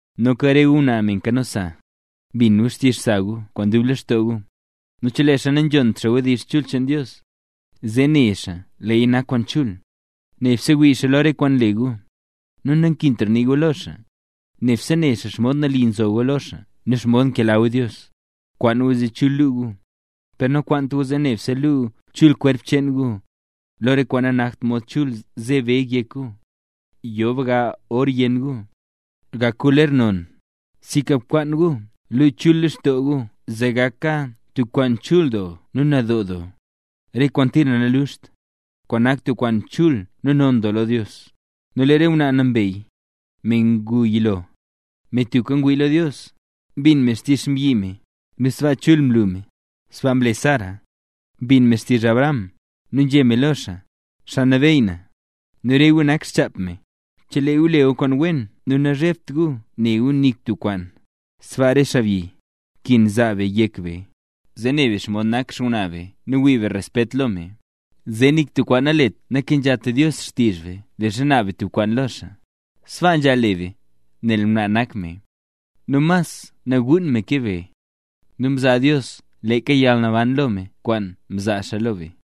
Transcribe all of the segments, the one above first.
Noka re gu ngwnaa me nkano sa, bin gu xtizh sa gu kwaan dub lextoo gu. Nu chelee xaa nanzhont xaa wdizh chul cheen Dios, zee ne xaa leeya nak kwaan chul, nebse wii xaa lo re kwaan nle gu, nu nankintra nii gu lo xaa. Nebse ne xaa xomod nali nzo gu lo xaa nu xomod nkela gu Dios. Kwaan gu zee chul luu gu; per nakwaant gu zee nebse luu chul kwerp cheen gu, lo re kwaan nak mod chul nze beg yek gu, yo bga or yenn gu, gak gu ler non. Sinka bkwaan gu luu chul lextoo gu zee gaka tub kwaan chul doo nu nadoo doo, re kwaane tira nanluxt, kwaan nak tub kwaan chul nu non doo lo Dios. Nu lee re ngwnaa nambey, me ngu yilo, me tubka mwii lo Dios, mbin me xtizh xmbyi me, nu sbaa chul mlu me. Sbaa mle Sara, mbin me xtizh Abraham, nu nzhé me lo xaa: “Xaa nabeyy na”. Nu re gu nak xchap me, chelee gu le gu kwaan wen nu nazhebt gu ne nik tub kwaan. Sbaaka re be xaabyi, nkin zaa be yek be, zee ne be xomod nak xngwnaa be nu wii be respet lo me, zee nik tub kwaan nalet nakenzhat Dios xtizh be leezha naab be tub kwaan lo xaa. Sbaa nzhaal le be, nel ngwnaa nak me, nu mas naguun me ke be; nu mzaa Dios leeka yalnaban lo me kwaan mzaa xaa lo be.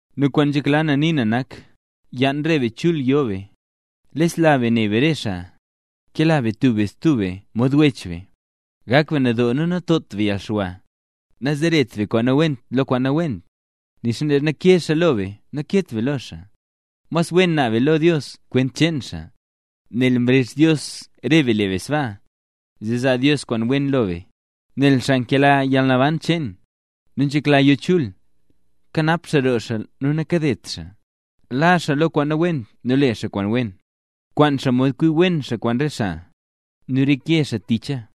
Nu kwaan nzhekla na nii na nak, yaan re be chul yo be, lesla be ne be re xaa, kela be tub be stub be mod wech be, gak be nadoo nu natot be yalxwa. Nazaret be kwaan nawent lo kwaan nawent, nixa leezha ke xaa lo be naket be lo xaa, mas wen naab be lo Dios kwent cheen xaa, nel Dios mrezh re be le be sbaa, zee zaa Dios kwaan wen lo be. Nel Xaa nkela yalnaban cheen, nu nzhekla yo chul, kanap xaa roo xaa nu nakadet xaa. Laa xaa lo kwaan nawent nu le xaa kwaan wen, kwaan xaa mod kwi wen xaa kwaan re xaa, nu reke xaa ticha.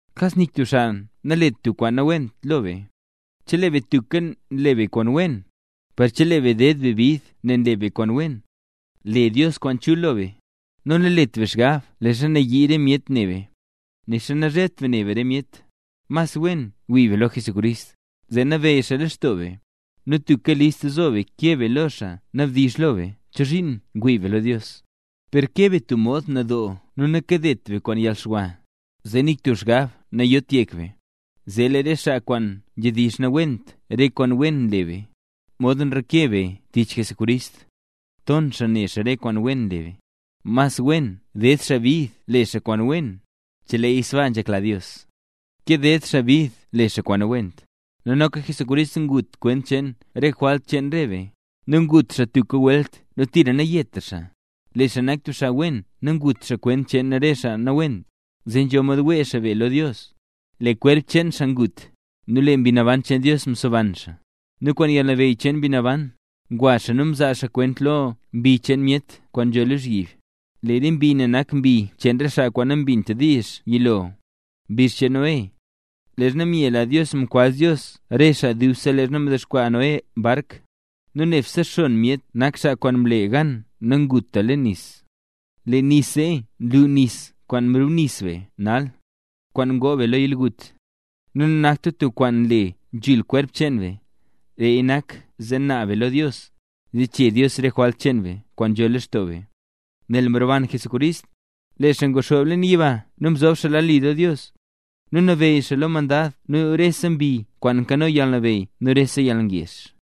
Kas nik tub xaa nalet tub kwaan nawent lo be, chelee be tubka nle be kwaan wen. Per chelee be ded be bid nel nle be kwaan wen, le Dios kwaan chul lo be. Nu nalet be xgab leezha nayii re myet ne be, nixa nazhebt be ne be re myet. Mas wen wii be lo Jesucrist, zee nabeyy xaa lextoo be; nu tubka list zo be keb be lo xaa nabdizh lo be chozhiin ngwii be lo Dios. Per keb be tub mod nadoo nu nakebt be kwaan yalxwa; zee nik tub xgab nayot yek be, zee lee re xaa kwaan nzhedizh nawent re kwaan wen nle be, modxa nreke be tich Jesucrist, ton xaa ne xaa re kwaan wen nle be. Mas wen ded xaa bid le xaa kwaan wen, cheleeya sbaa nzhekla Dios, ke ded xaa bid le xaa kwaan nawent. Nu noka Jesucrist ngut kwent cheen re jwalt cheen re be, nu ngut xaa tubka welt nu tira nayetra xaa. Lee xaa nak tub xaa wen nu ngut xaa kwent cheen re xaa nawent, zee nzho mod wee xaa be lo Dios. Lee kwerp cheen xaa ngut, nu lee Mbi Naban cheen Dios mseban xaa. Nu kwaan yalnabeyy cheen Mbi Naban, ngwa xaa nu mzaa xaa kwent lo re mbi cheen myet kwaan nzho lozhyib. Lee re mbi ne nak mbi cheen re xaa kwaan nambint diizh yilo, mbizh cheen Noé, leezha myela Dios nkambaz Dios re xaa dubse leezha mdexkwaa Noé bark. Nu nebse xon myet nak xaa kwaan mle gan nanguta leen nis. Lee nis zee nlu nis kwaan nrubnis be nal, kwaan ngoo be lo yalgut; nu nanakta tub kwaan nle nzhul kwerp cheen be, leeya nak zee naab be lo Dios, zee chee Dios re jwalt cheen be kwaan nzho lextoo be, nel mroban Jesucrist. Lee xaa nguxoob leen yiba nu nzob lad li lo Dios, nu nabeyy xaa lo re mandad nu lo rese mbi kwaan nkano yalnabeyy nu rese yalngezh.